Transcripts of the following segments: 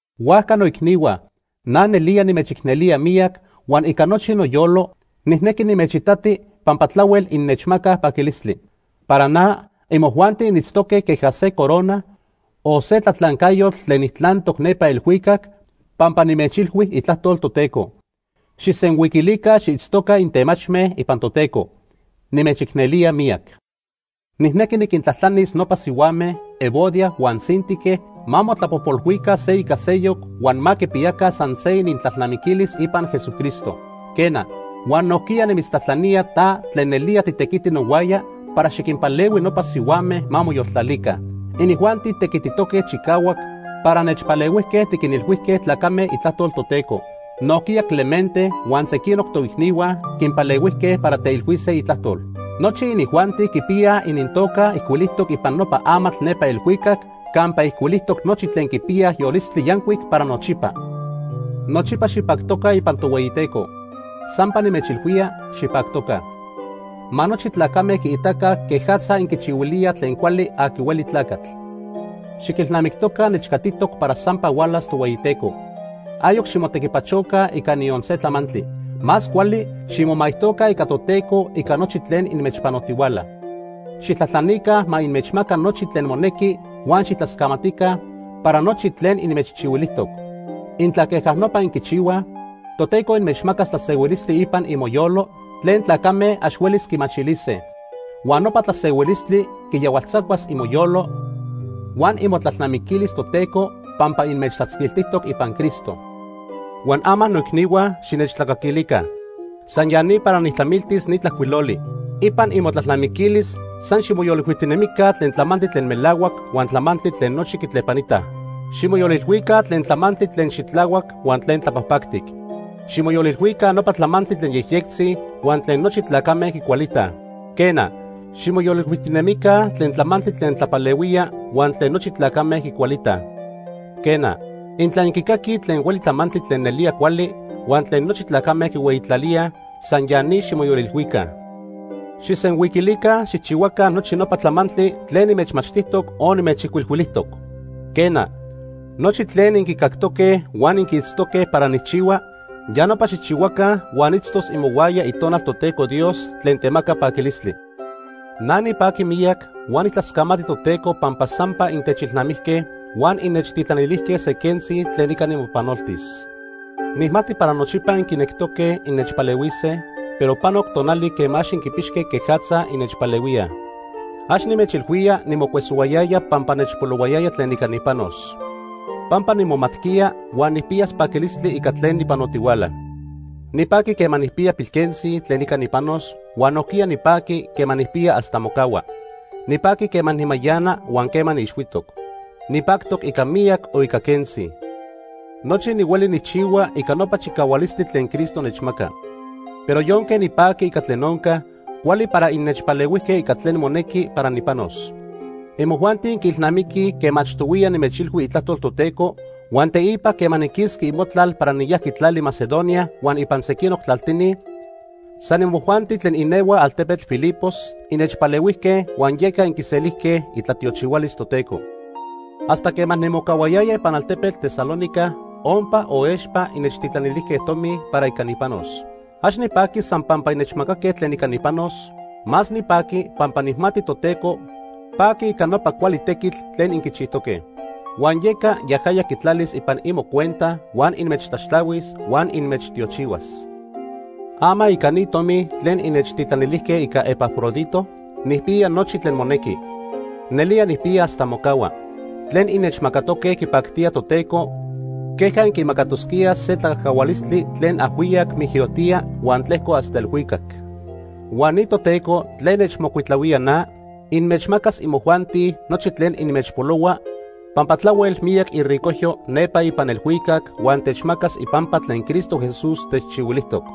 Huajca, noicnihua, na nelía nimechicnelía miyac huan ica nochi noyolo nijnequi nimechitati pampa tlahuel innechmacaj paquilistli. Para na, imojuanti initztoque queja se corona o se tlatlancayotl tlen nijtlantoc nepa elhuicac pampa nimechilhui itlajtol Toteco. Xijsenhuiquilica xiitztoca intemachme ipan Toteco. Nimechicnelía miyac. Nijnequi niquintlajtlanis nopa sihuame Evodia huan Síntique ma motlapojpolhuica se ica seyoc huan ma quipiyaca san se inintlalnamiquilis ipan Jesucristo. Quena, huan nojquiya nimitztlajtlanía ta tlen nelía titequiti nohuaya para xiquinpalehui nopa sihuame ma moyoltlalica. Inijuanti tequititoque chicahuac para nechpalehuijque tiquinilhuijque tlacame itlajtol Toteco. Nojquiya Clemente huan sequinoc toicnihua quinpalehuijque para teilhuise itlajtol. Nochi inijuanti quipiyaj inintoca ijcuilijtoc ipan nopa amatl nepa elhuicac campa ijcuilijtoc nochi tlen quipiyaj yolistli yancuic para nochipa. Nochipa xipactoca ipan Tohueyiteco. Sampa nimechilhuía, xipactoca. Ma nochi tlacame quiitaca quejatza inquichihuilíaj tlen cuali aqui hueli tlacatl. Xiquilnamictoca nechcatitoc para sampa hualas Tohueyiteco. Ayoc ximotequipachoca ica niyon se tlamantli. Más cuali ximomaijtoca ica Toteco ica nochi tlen inmechpanotihuala. Xijtlajtlanica ma inmechmaca nochi tlen monequi huan xijtlascamatica para nochi tlen inmechchihuilijtoc. Intla queja nopa inquichihuaj, Toteco inmechmacas tlasehuilistli ipan imoyolo tlen tlacame ax huelis quimachilise. Huan nopa tlasehuilistli quiyahualtzacuas imoyolo huan imotlalnamiquilis Toteco pampa inmechtlatzquiltijtoc ipan Cristo. Huan ama noicnihua, xinechtlacaquilica. San ya ni para nijtlamiltis ni tlajcuiloli. Ipan imotlalnamiquilis, san ximoyolilhuijtinemica tlen tlamantli tlen melahuac huan tlamantli tlen nochi quitlepanitaj. Ximoyolilhuica tlen tlamantli tlen xitlahuac huan tlen tlapajpactic. Ximoyolilhuica nopa tlamantli tlen yejyectzi huan tlen nochi tlacame quicualitaj. Quena, ximoyolilhuijtinemica tlen tlamantli tlen tlapalehuía huan tlen nochi tlacame quicualitaj. Quena, intla inquicaquij tlen hueli tlamantli tlen nelía cuali huan tlen nochi tlacame quihueyitlalíaj, san ya ni ximoyolilhuica. Xijsenhuiquilica xijchihuaca nochi nopa tlamantli tlen nimechmachtijtoc o nimechijcuilhuilijtoc. Quena, nochi tlen inquicactoque huan inquiitztoque para nijchihua, ya nopa xijchihuaca huan itztos imohuaya Itonal Toteco Dios tlen temaca paquilistli. Na nipaqui miyac huan nijtlascamati Toteco pampa sampa intechilnamijque huan innechtitlanilijque se quentzi tlen ica nimopanoltis. Nijmati para nochipa inquinectoque innechpalehuise, pero panoc tonali quema ax inquipixque quejatza innechpalehuíaj. Ax nimechilhuía nimocuesohuayaya pampa nechpolohuayaya tlen ica nipanos. Pampa nimomatquiya huan nijpiyas paquilistli ica tlen nipanotihuala. Nipaqui quema nijpiya pilquentzi tlen ica nipanos huan nojquiya nipaqui quema nijpiya hasta mocahua. Nipaqui quema nimayana huan quema niixhuitoc. Nipactoc ica miyac o ica quentzi. Nochi nihueli nijchihua ica nopa chicahualistli tlen Cristo nechmaca. Pero yonque nipaqui ica tlen onca, cuali para innechpalehuijque ica tlen monequi para nipanos. Imojuanti inquiilnamiquij quema achtohuiya nimechilhui itlajtol Toteco huan teipa quema niquisqui imotlal para niyajqui tlali Macedonia huan ipan sequinoc tlaltini, san imojuanti tlen inehuaj altepetl Filipos, innechpalehuijque, huan yeca inquiselijque itlatiochihualis Toteco. Hasta quema nimocahuayaya ipan altepetl Tesalónica, ompa o expa innechtitlanilijque tomi para ica nipanos. Ax nipaqui san pampa innechmacaque tlen ica nipanos, más nipaqui pampa nijmati Toteco paqui ica nopa cuali tequitl tlen inquichijtoque. Huan yeca yajaya quitlalis ipan imocuenta huan inmechtlaxtlahuis huan inmechtiochihuas. Ama ica ni tomi tlen innechtitlanilijque ica Epafrodito, nijpiya nochi tlen monequi. Nelía nijpiya hasta mocahua. Tlen innechmacatoque quipactía Toteco queja inquimacatosquíaj se tlacajcahualistli tlen ajhuiyac mijyotía huan tlejco hasta elhuicac. Huan ni Toteco tlen nechmocuitlahuía na, inmechmacas imojuanti nochi tlen inmechpolohua pampa tlahuel miyac iricojyo nepa ipan elhuicac huan techmacas ipampa tlen Cristo Jesús techchihuilijtoc.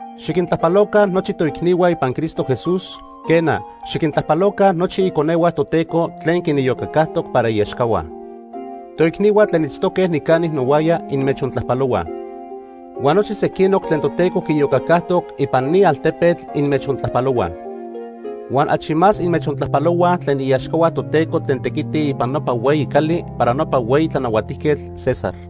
Xiquintlajpaloca nochi toicnihua ipan Cristo Jesús, quena, xiquintlajpaloca nochi iconehua Toteco tlen quiniyocacajtoc para iaxcahua. Toicnihua tlen itztoque nicani nohuaya inmechontlajpalohuaj. Huan nochi sequinoc tlen Toteco quiiyocacajtoc ipan ni altepetl inmechontlajpalohuaj. Huan achi más inmechontlajpalohuaj tlen iaxcahua Toteco tlen tequitij ipan nopa hueyi cali para nopa hueyi tlanahuatijquetl, César.